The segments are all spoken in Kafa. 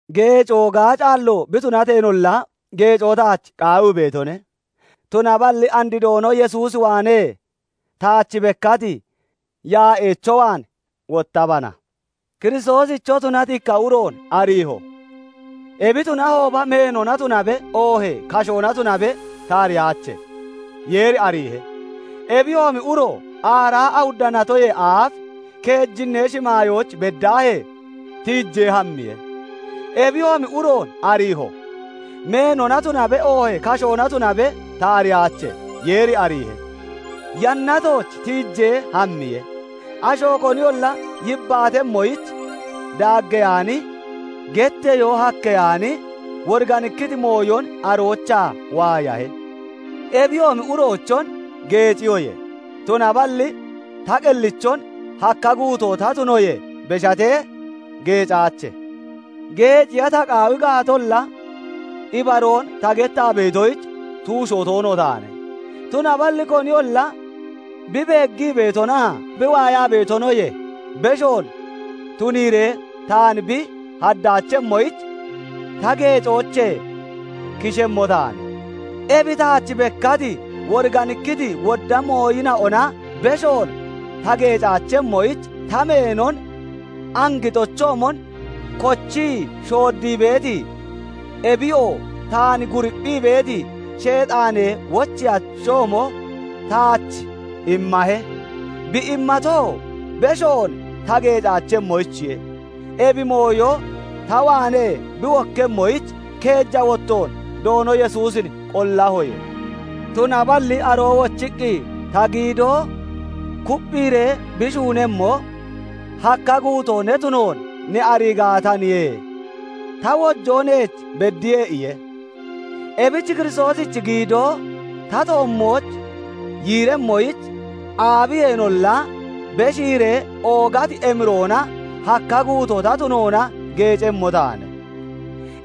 Geecoo gaacaallo bi tunateenolla, geecoo taach qaawii beetone; tunaballi and Doono Yesuus waanee taach bekkati yaa'eecho waan wottabana. Kiristoosicho tunati ikka uroon ariiho; ebi tunahooba meenona tunabe, oohee kashoona tunabe ta ariyaache; Yeeri ariihe. Ebiyoomi uro aaraa awudda natoyee aaf keejinnee shimaayooch beddaahee tiijee hammiye. Ebiyoomi uroon ariiho; meenona tunabe, oohee kashoona tunabe ta ariyaache; Yeeri ariihe; Yannatooch tiijee hammiye; asho koniyolla yibbaatemmoyich daaggeyaani, getteyoo hakkeyaani, woriganikkiti mooyon aroochaa waayahe. Ebiyoomi uroochon geeciyoye; tunaballi ta qellichon hakka guutoo ta tunoyee beshatee geecaache. Geeciya ta qaawi gaatolla, ibaroon ta gettaa beetoyich tuusho toono taane; tunaballi koniyolla bi beeggii beetonaa bi waayaa beetonoyee beshoon tuniiree taan bi haddaachemmoyich ta geecoochee kishemmo taane. Ebi taach bekkati, woriganikkiti wodda mooyina'ona beshoon ta geecaachemmoyich, ta meenon angixochoomon kochii shooddii beeti, ebiyoo taan guripphii beeti Sheexaanee wocheyachoomo taach immahe; bi immatoo, beshoon ta geecaachemmoyichiye. Ebi mooyo ta waanee bi wokkemmoyich, keeja wottoon Doono Yesuusin qollahoye. Tunaballi aroo wochiqqi, "Ta giidoo kupphiiree bi shuunemmo, hakka guutoo ne tunoon ne arii gaataniye; ta wojoo neech beddiye" iye. Ebich Kiristoosichi giidoo ta toommooch yiiremmoyich, aabiyeenolla beshiiree oogati emiroona hakka guutoo ta tunoona geecemmo taane.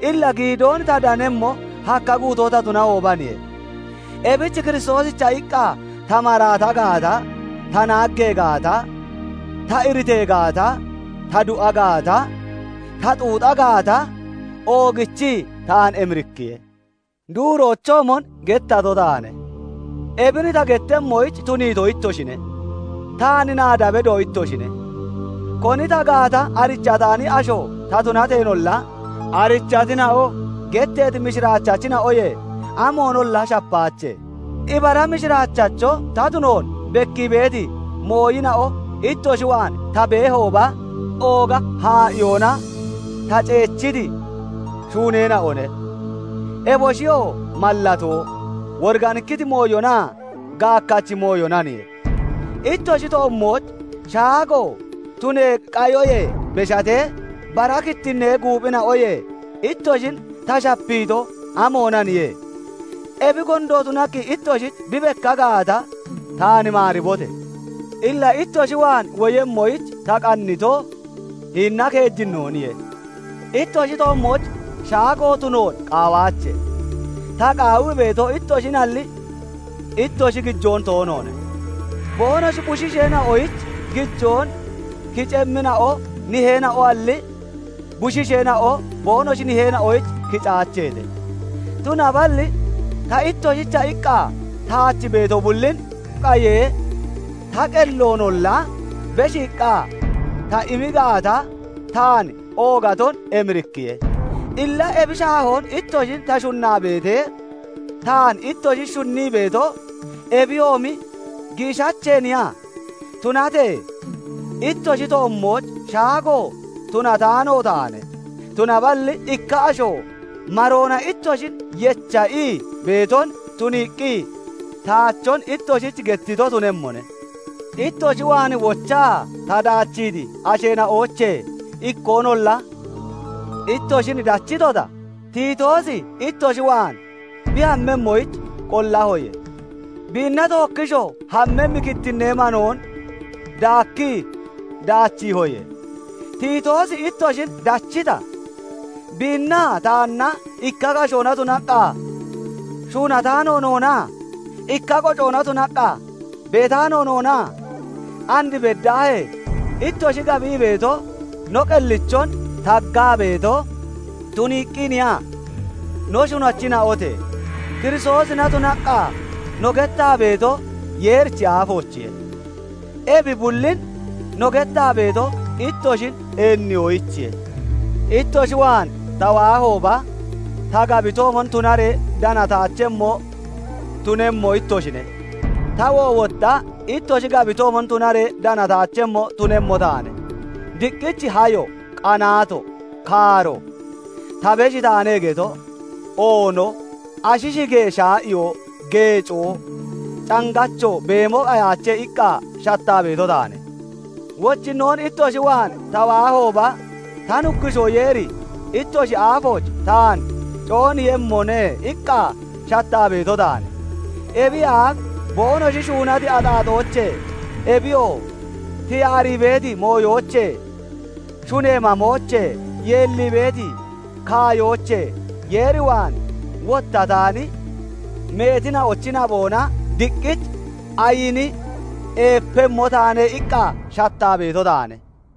Illa giidoon ta danemmo, hakka guutoo ta tunahoobaniye; ebich Kiristoosicha iqqa ta maraata gaata, ta naaggee gaata, ta iritee gaata, ta du'a gaata, ta xuuxa gaata, oogichii taan emirikkiye. Duuroochoomon gettato taane; ebin ta gettemmoyich tuniito ittoshine; taan naada bedo ittoshine; koni ta gaata arichataani asho ta tunateenolla, arichatina'o getteeti mishiraachachina'oyee amoonolla shapaache. Ibara mishiraachacho ta tunoon bekkii beeti mooyina'o ittoshi waan ta beehooba, ooga haa'iyoona ta ceechiti shuuneena'one; eboshiyoo mallatoo, woriganikkiti mooyonaa gaakkachi mooyonaniye. Ittoshi toommooch shaago tunee qayoyee beshatee, bara kittinnee guuphina'oyee ittoshin ta shapiito, amoonaniye? Ebi gondo tunaqqi ittoshich bi bekka gaata, taan maaribote! Illa ittoshi waan womoyich ta qannito, hinina keejinnooniye; ittoshi toommooch shaago tunoon qaawaache. Ta qaawii beeto, ittoshinalli, ittoshi gijoon toonoone. Boonoshi bushiisheena'oyich gijoon kicemmina'o niheena'oalli, bushiisheena'o boonoshi niheena'oyich kicaacheete. Tunaballi ta ittoshicha iqqa taach beeto bullin qayee ta qelloonolla beshiiqqa ta immi gaata, taan oogaton emirikkiye. Illa ebi shaahoon ittoshin ta shunnaa beetee, taan ittoshi shunnii beeto, ebiyoomi giishacheeniya? Tunatee ittoshi toommooch shaago tunataano taane; tunaballi ikka asho maroona ittoshin yecha ii beeton tuniiqqi taachon ittoshich gettito tunemmone. Ittoshi waan wochaa ta daachiiti asheena'oochee ikkoonolla ittoshin dachitota? Tiitoosi ittoshi waan bi hammemmoyich qollahoye; biinna tookkishoo hammemmi kittinnee manoon daakkii daachiihoye; Tiitoosi ittoshin dachita? Biinnaa taanna ikka kashoona tunaqqa shuunataano noona? Ikka qocoona tunaqqa beetaano noona? And beddaahee ittoshi gabii beeto, no qellichon taggaa beeto tuniiqqiiniya? No shunachina'ote! Kiristoosina tunaqqa no gettaa beeto Yeerichi aafoochiye; ebi bullin no gettaa beeto, ittoshin eenniyoyichiye. Ittoshi waan ta waahooba, ta gabitoomon tunaree danataachemmo tunemmo ittoshine; tawoo wotta ittoshi gabitoomon tunaree danataachemmo tunemmo taane; diqqich hayo, qanaato, kaaro, "Ta beshi taane" geto, oono, ashi shigee shaa'iyo, geecoo, cangacho beemo qayaache iqqa shattaa beeto taane. Wochinnoon ittoshi waan ta waahooba, ta Nuggushoo Yeeri ittoshi aafooch taan cooniiyemmone iqqa shattaa beeto taane; ebiyee aaf boonoshi shuunati axaaxoochee, ebiyoo tiyaarii beeti mooyoochee, shunee mamoochee, yeellii beeti kaayoochee Yeer waan wottataani meetina'ochi naboona diqqich ayini eepemmo taane iqqa shattaa beeto taane.